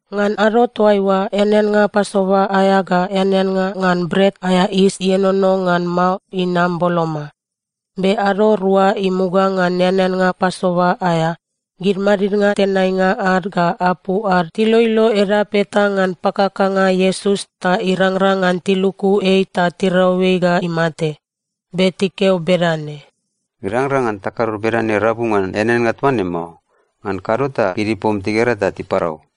Ngan ado toaiua, eaneannga Pasova aea ga eaneannga ngan Bret aea Yis Ienono ngan Mao inam boloma. Be ado rua imuga ngan eaneannga Pasova aea, gid madidnga tenainga ad ga apu ad tiloilo edap eta ngan pakakanga Iesus ta irangrang ngan tiluku ei ta tirau ei ga imate. Be tikeo bedane, “Irangrang ngan takado bedane rabu ngan eaneannga toa ne mao. Ngan kado ta gid ipom tigera ta tiparau.”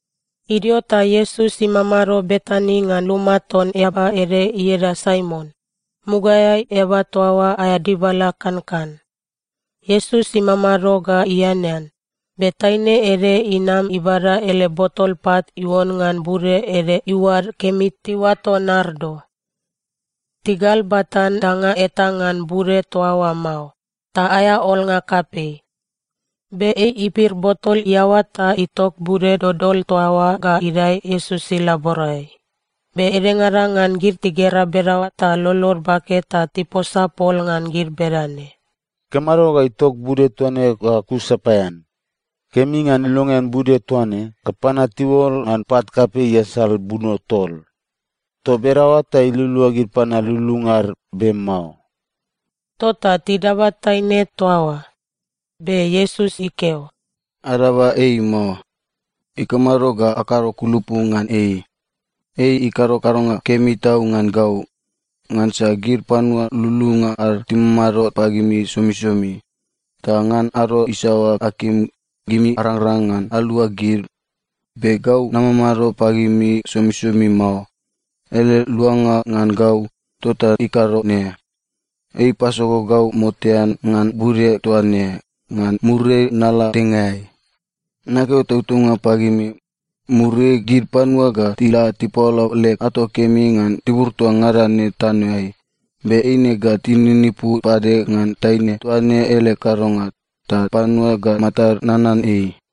Idio ta Iesus imamado Betani ngan luma ton eaba ede ieda Saimon. Mugaeai eaba toa oa aea dibala kankan. Iesus imamado ga ianean, be taine ede inam ibada ele botol pat iuon ngan bude ede iuad kemi tiuato nardo. Tigalbatan danga eta ngan bude toa oa mao, ta aea olnga kapei. Be ei ipir botol iaoa ta itok bude dodol toa oa ga idae Iesus ilaborai. Be edengada ngan gid tigera bedaoa ta lolod bake ta tiposa pol ngan gid bedane, “Ikamado ga itok bude toa ne ga kus sapaean? Kemi ngan ilongean bude toa ne ga panua tiuol ngan pat kapei iasal buno tol. Toa bedaoa ta ilualua gid panua lululunga ad, be mao.” Tota tidaba taine toa oa. Be Iesus ikeo, “Adaba ei mao. Ikamado ga akado kulupu ngan ei? Ei ikado kadonga kemi tau ngan gau. Ngansa gid panua lululunga ad timamado pagimi somisomi. Ta ngan ado isaoa akim, gimi arangrang ngan alua gid. Be gau namamado pagimi somisomi mao. Ele luanga ngan gau, tota ikado ne. Ei ipasogo gau motean ngan bude toa ne, ngan muriai nala dengaeai. Nakeo tautaunga pagimi, muriai gid panua ga tila tipaola leg ato kemi ngan tibur toa ngada ne tanoeai, be eine ga tininipu pade ngan taine toa ne ele kadonga, ta panua ga matad nanan ei.”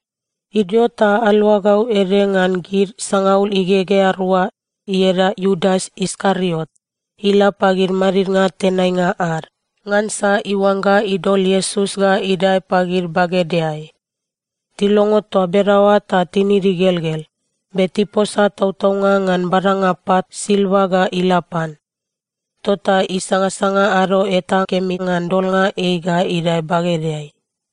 Idio ta aluagau ede ngan gid sangaul igegea rua, ieda Iudas Iskariot, ila pagid madidnga tenainga ad, ngansa iuangga idol Iesus ga idae pagid bagedeai. Tilongo toa bedaoa ta tinid igelgel, be tiposa tautaunga ngan badanga pat silva ga ila pan. Tota isangasanga ado eta kemi ngan dolnga ei ga idae bagedeai.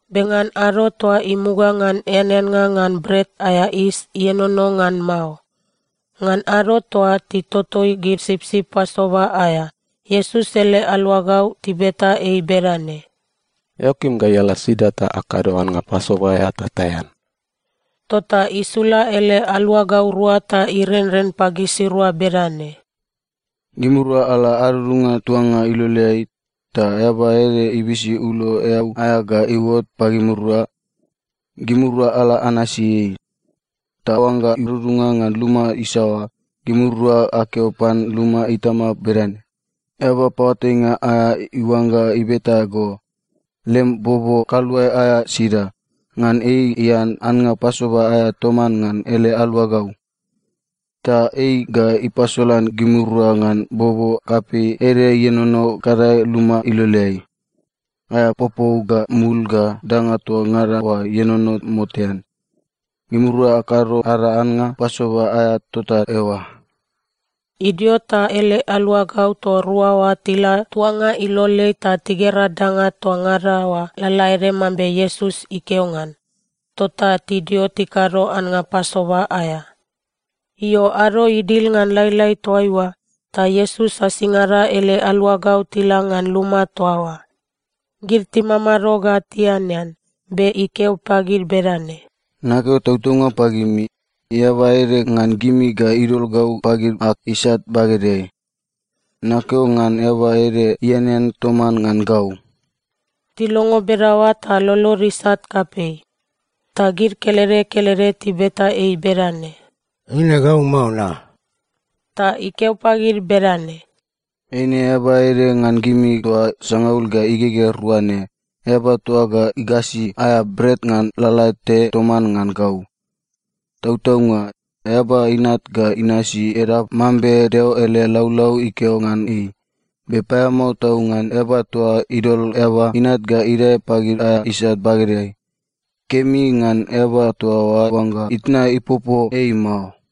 Be ngan ado toa imuga ngan eaneannga ngan Bret aea Yis Ienono ngan Mao, ngan ado toa titotoi gid sipsip Pasova aea, Iesus ele aluagau tibeta ei bedane, “Eao kim gai ala sida ta akado annga Pasova aea ta taean?” Tota isula ele aluagau rua ta irenren pagisirua bedane, “Gimirua ala adudunga tuanga iloleai, ta eaba ede ibisi ulo eau aea ga iuot pagimirua. Gimirua ala anasi ei. Ta oangga idudunga ngan luma isaoa, gimirua akeo pan luma itama bedane, ‘Eaba Paoatainga aea iuangga ibeta go: Lem bobo kaluae aea sida, ngan ei ian annga Pasova aea toman ngan ele aluagau?’ Ta ei ga ipasolan gimirua ngan bobo kapei ede ienono gadae luma iloleai. Aea popou ga mul ga danga toa ngada oa ienono motean. Gimirua akado ada annga Pasova aea tota eoa.” Idio ta ele aluagau toa rua oa tila tuanga iloleai ta tigera danga toa ngada oa lalaede mambe Iesus ikeo ngan. Tota tidio tikado annga Pasova aea. Io, ado idil ngan lailai toaiua, ta Iesus asingada ele aluagau tila ngan luma toa oa. Gid timamado ga tianean, be ikeo pagid bedane, “Nakeo tautaunga pagimi, eaba ede ngan gimi ga idol gau pagid ag isat bagedeai. Nakeo ngan eaba ede ianean toman ngan gau.” Tilongo bedaoa ta lolod isat kapei, ta gid kelede kelede tibeta ei bedane, “Eine gau mao, na?” Ta ikeo pagid bedane, “Eine eaba ede ngan gimi toa sangaul ga igegea rua ne, eaba toa ga igasi aea bret ngan lalate toman ngan gau. Tautaunga, Eaba Inat ga inasi edap mambe Deo ele laulau ikeo ngan ei, be paeamao tau ngan eaba toa idol Eaba Inat ga idae pagid aea isat bagedeai! Kemi ngan eaba toa oa oangga itna ipopo ei mao.”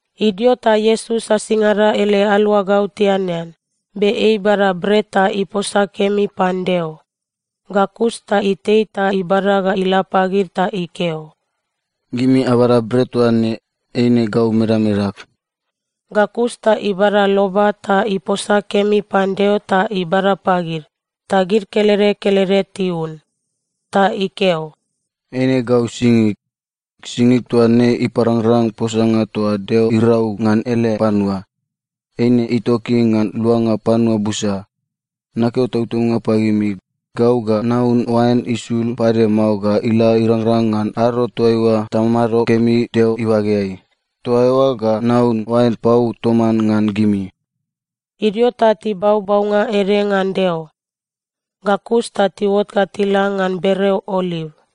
Idio ta Iesus asingada ele aluagau tianean, be ei ibada bret ta iposa kemi pan Deo. Ga kus ta itei ta ibada ga ila pagid ta ikeo, “Gimi abada bret toa ne, eine gau medamedag.” Ga kus ta ibada loba ta iposa kemi pan Deo ta ibada pagid, ta gid kelede kelede tiun. Ta ikeo, “Eine gau singig. Singig toa ne iparangrang posanga toa Deo irau ngan ele panua. Eine itoki ngan luanga panua busa. Nakeo tautaunga pagimi, gau ga naun oain isul pade mao ga ila irangrang ngan ado toaiua tamado kemi Deo ibageai. Toa eoa ga naun oain pau toman ngan gimi.” Idio ta tibau baunga ede ngan Deo, ga kus ta tiuot ga tila ngan bereo Oliv.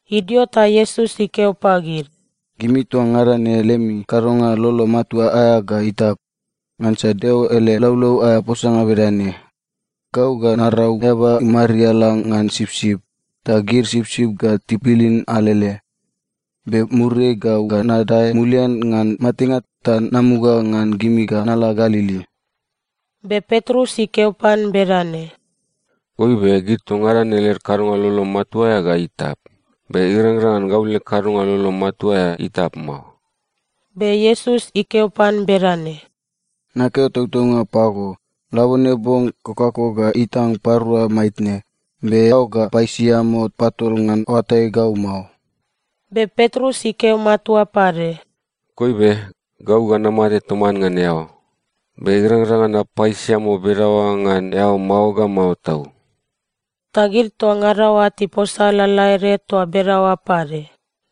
Idio ta Iesus ikeo pagid, “Gimi toa ngada ne lemi kadonga lolo matua aea ga itap. Ngansa Deo ele laulau aea posanga bedane: “‘Gau ga narau eaba imariala ngan sipsip, ta gid sipsip ga tibilin alele.’ Be muriai, gau ga nadae mulian ngan matenga ta namuga ngan gimi ga nala Galili.” Be Petrus ikeo pan bedane, “Goibe, gid toa ngada ne led kadonga lolo matua aea ga itap, be irangrang ngan gau leg kadonga lolo matua aea itap mao.” Be Iesus ikeo pan bedane, “Nakeo tautaunga pago, labone bong, kokako ga itang parua maitne, be eao ga paisiamo patol ngan oatai gau mao.” Be Petrus ikeo matua pade, “Goibe, gau ga namate toman ngan eao, be irangrang ngan napaisiamo bedaoa ngan eao mao ga mao tau.” Ta gid toa ngada oa tiposa lalaede toa bedaoa pade.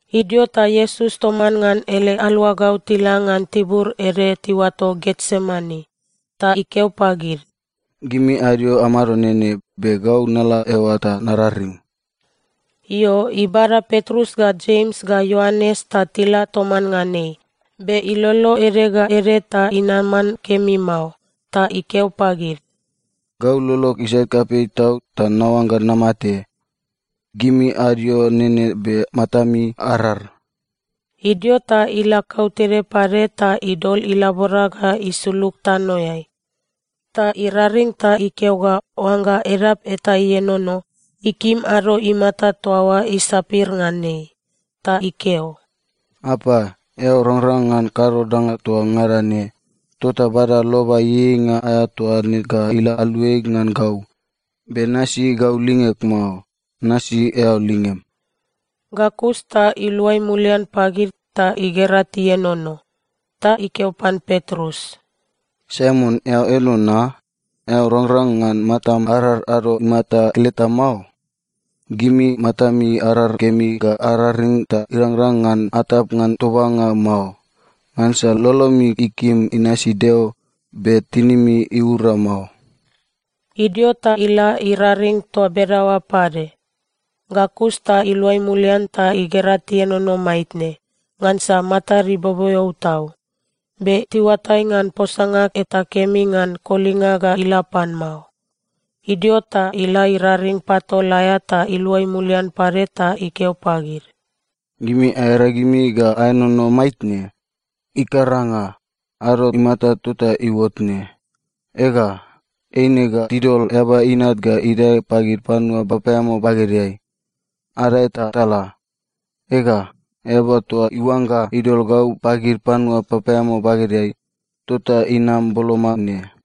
Idio ta Iesus toman ngan ele aluagau tila ngan tibur ede tiuato Getsemani, ta ikeo pagid, “Gimi adio amado nene, be gau nala eoa ta nararing.” Io, ibada Petrus ga Jems ga Ioanes ta tila toman ngan ei, be ilolo ede ga ede ta inaman kemi mao. Ta ikeo pagid, “Gau lolog isat kapei tau, ta naoangga namate. Gimi adio nene be matami arar.” Idio ta ila kautede pade ta idol ilabora ga isulug tanoeai. Ta iraring ta ikeo ga oangga edap eta ienono, ikim ado imata toa oa isapir ngan ei. Ta ikeo, “Apa, eao rangrang ngan kado danga toa ngada ne. Tota bada loba ieieinga aea toa ne ga ila aluai ngan gau. Be nasi gau lingeg mao. Nasi eao lingem.” Ga kus ta iluai mulian pagid, ta igera tienono. Ta ikeo pan Petrus, “Saimon, eao eno na? Eao rangrang ngan matam arar ado imata keleta mao? Gimi matami arar kemi ga araring ta irangrang ngan atap ngan tobanga mao. Ngansa lolomi ikim inasi Deo, be tinimi iura mao.” Idio ta ila iraring toa bedaoa pade. Ga kus ta iluai mulian ta igera tienono maitne, ngansa matad iboboeo tau. Be tiuatai ngan posanga eta kemi ngan kolinga ga ila pan mao. Idio ta ila iraring patol aea ta iluai mulian pade ta ikeo pagid, “Gimi aearagimi ga aenono maitne? Ikaranga! Ado imata tota iuot ne. Ega, eine ga tidol Eaba Inat ga idae pagid panua papaeamao bagedeai. Adae ta tala! Ega, eaba toa iuangga idol gau pagid panua papaeamao bagedeai, tota inam boloma ne.”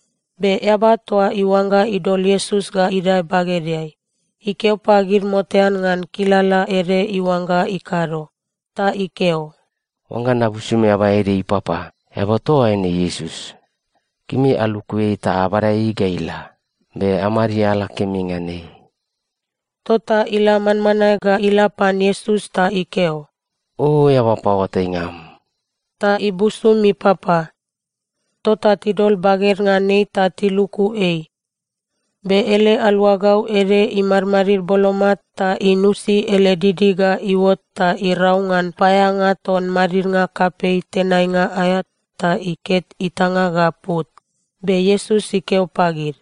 Be eaba toa iuangga idol Iesus ga idae bagedeai, ikeo pagid motean ngan kilala ede iuangga ikado. Ta ikeo, “Oangga nabusum eaba ede ipapa, eaba toa oa eine Iesus. Gimi aluku ei ta abada ei ga ila, be amariala kemi ngan ei.” Tota ila manmanae ga ila pan Iesus ta ikeo, “O eaba paoatainga am,” ta ibusum ipapa. Tota tidol baged ngan ei ta tiluku ei. Be ele aluagau ede imadmadid boloma ta inusi ele didi ga iuot ta irau ngan paeaeanga ton madidnga kapei tenainga aea ta iket itanga ga put. Be Iesus ikeo pagid,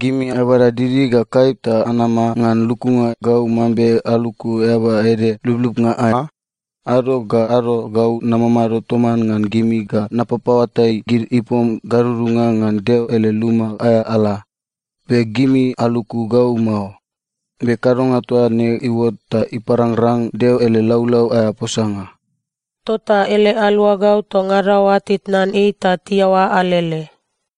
“Gimi abada didi ga kaip ta anama ngan lukunga gau mambe aluku eaba ede lublubnga aea? Ado ga ado gau namamado toman ngan gimi ga napapaoatai gid ipom gadudunga ngan Deo ele luma aea ala, be gimi aluku gau mao. Be kadonga toa ne iuot ta iparangrang Deo ele laulau aea posanga.” Tota ele aluagau toa ngada oa titnan ei ta tiaoa alele.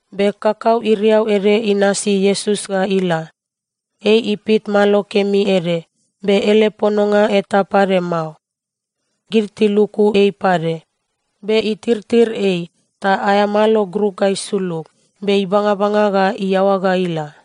Be kakau iriau ede inasi Iesus ga ila. Ei ipit malo kemi ede, be ele pononga eta pade mao. Gid tiluku ei pade, be itirtir ei, ta aea malo gruk ga isulug, be ibangabanga ga iaoa ga ila.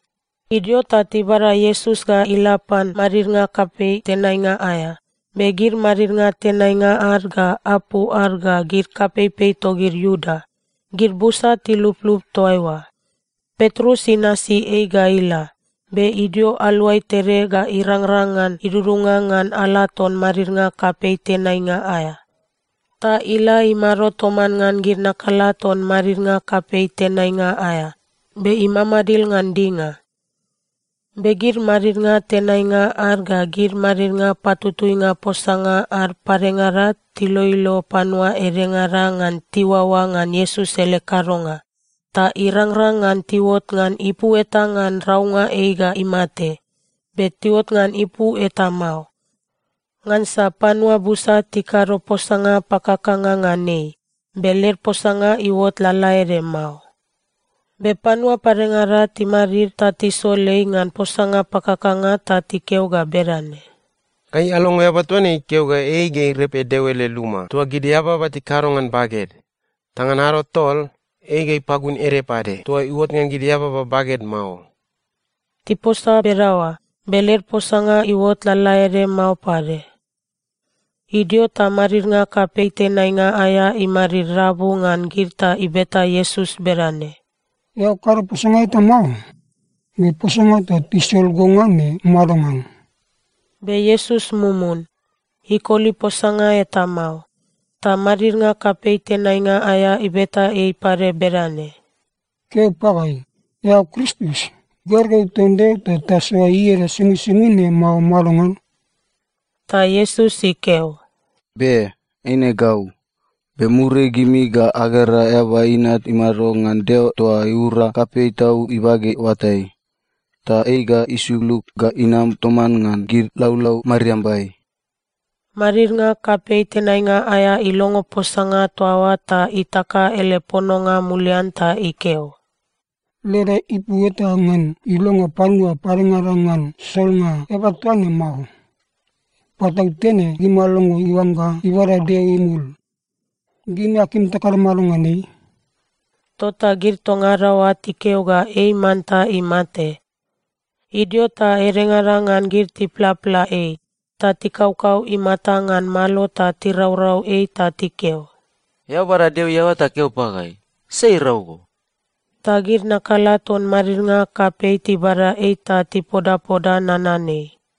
Idio ta tibada Iesus ga ila pan madidnga kapei tenainga aea. Be gid madidnga tenainga ad ga apu ad ga gid kapeipei togid Iuda, gid busa tiluplup toa eoa. Petrus inasi ei ga ila, be idio aluai tede ga irangrang ngan idudunga ngan ala ton madidnga kapei tenainga aea. Ta ila imado toman ngan gid nakala ton madidnga kapei tenainga aea, be imamadil ngan dinga. Be gid madidnga tenainga ad ga gid madidnga patutuinga posanga ad padengada tiloilo panua edengada ngan tiuaoa ngan Iesus ele kadonga, ta irangrang ngan tiuot ngan ipu eta ngan raunga ei ga imate. Be tiuot ngan ipu eta mao. Ngansa panua busa tikado posanga pakakanga ngan ei, be led posanga iuotot lalaede mao. Be panua padengada timadid ta tisol ei ngan posanga pakakanga ta tikeo ga bedane, “Gai alongo eaba toa ne ikeo ga ei ga irepe Deo ele luma toa gid eababa tikado ngan baged, ta ngan ado tol, ei ga ipagun ede pade toa iuot ngan gid eababa baged mao.” Tiposa bedaoa, be led posanga iuot lalaede mao pade. Idio ta madidnga kapei tenainga aea imadid rabu ngan gid ta ibeta Iesus bedane, “Eao kado posanga eta mao? Be posanga toa tisol go ngan ne madongan?” Be Iesus mumun. Ikoli posanga eta mao. Ta madidnga kapei tenainga aea ibeta ei pade bedane, “Keo pagai. Eao Kristus, gergeu ton Deo toa tasoa ieda somisomi ne, mao madongan?” Ta Iesus ikeo, “Be, eine gau. Be muriai gimi ga agera Eaba Inat imado ngan Deo toa iura kapei tau ibage oatai. Ta ei ga isulug ga inam toman ngan gid laulau mariambai.” Madidnga kapei tenainga aea ilongo posanga toa oa ta itaka ele pononga mulian ta ikeo, “Leda ipu eta ngan ilonga panua padengada ngan solnga eaba toa ne mao. Patautene gimi alongo iuangga ibada Deo imul! Gimi akim takado mado ngan ei?” Tota gid toa ngada oa tikeo ga ei manta imate. Idio ta edengada ngan gid tiplapla ei. Ta tikaukau imata ngan malo ta tiraurau ei ta tikeo, “Eao bada Deo iaoa ta keo pagai! Sai irau go?” Ta gid nakala ton madidnga kapei tibada ei ta tipodapoda nanan ei.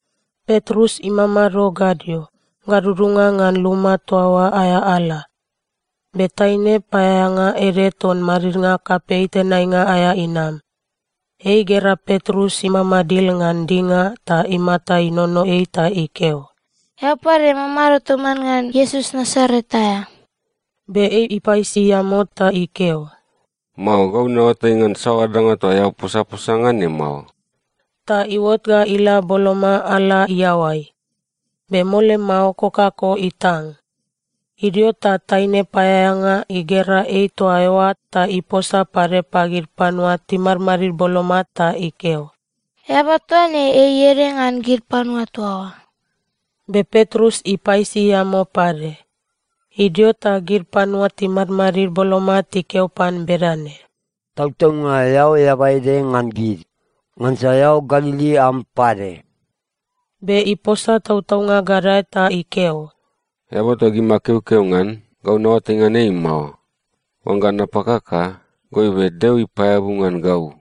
Petrus imamado gadio, gadudunga ngan luma toa oa aea ala, be taine paeaeanga ede ton madidnga kapei tenainga aea inam. Ei igera Petrus imamadil ngan dinga ta imata inono ei ta ikeo, “Eao pade mamado toman ngan Iesus Nasaret aea.” Be ei ipaisiamo ta ikeo, “Mao. Gau naoatai ngan saoa danga toa eao posaposa ngan ne mao.” Ta iuot ga ila boloma ala iaoai, be mole mao kokako itang. Idio ta taine paeaeanga igera ei toa eoa ta iposa pade pagid panua timadmadid boloma ta ikeo, “Eaba toa ne, ei ede ngan gid panua toa oa.” Be Petrus ipaisiamo pade. Idio ta gid panua timadmadid boloma tikeo pan bedane, “Tautaunga! Eao eaba ede ngan gid, ngansa eao Galili am pade.” Be iposa tautaunga gadae ta ikeo, “Eaba toa gimi akeokeo ngan, gau naoatai ngan ei mao. Oangga napakaka, goibe, Deo ipaeabu ngan gau.”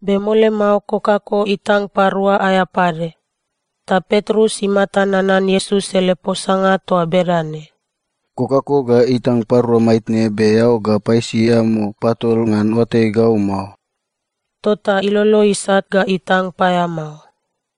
Be mole mao, kokako itang parua aea pade. Ta Petrus imata nanan Iesus ele posanga toa bedane, “Kokako ga itang parua maitne, be eao ga paisiamo patol ngan oatai gau mao.” Tota ilolo isat ga itang paeamao.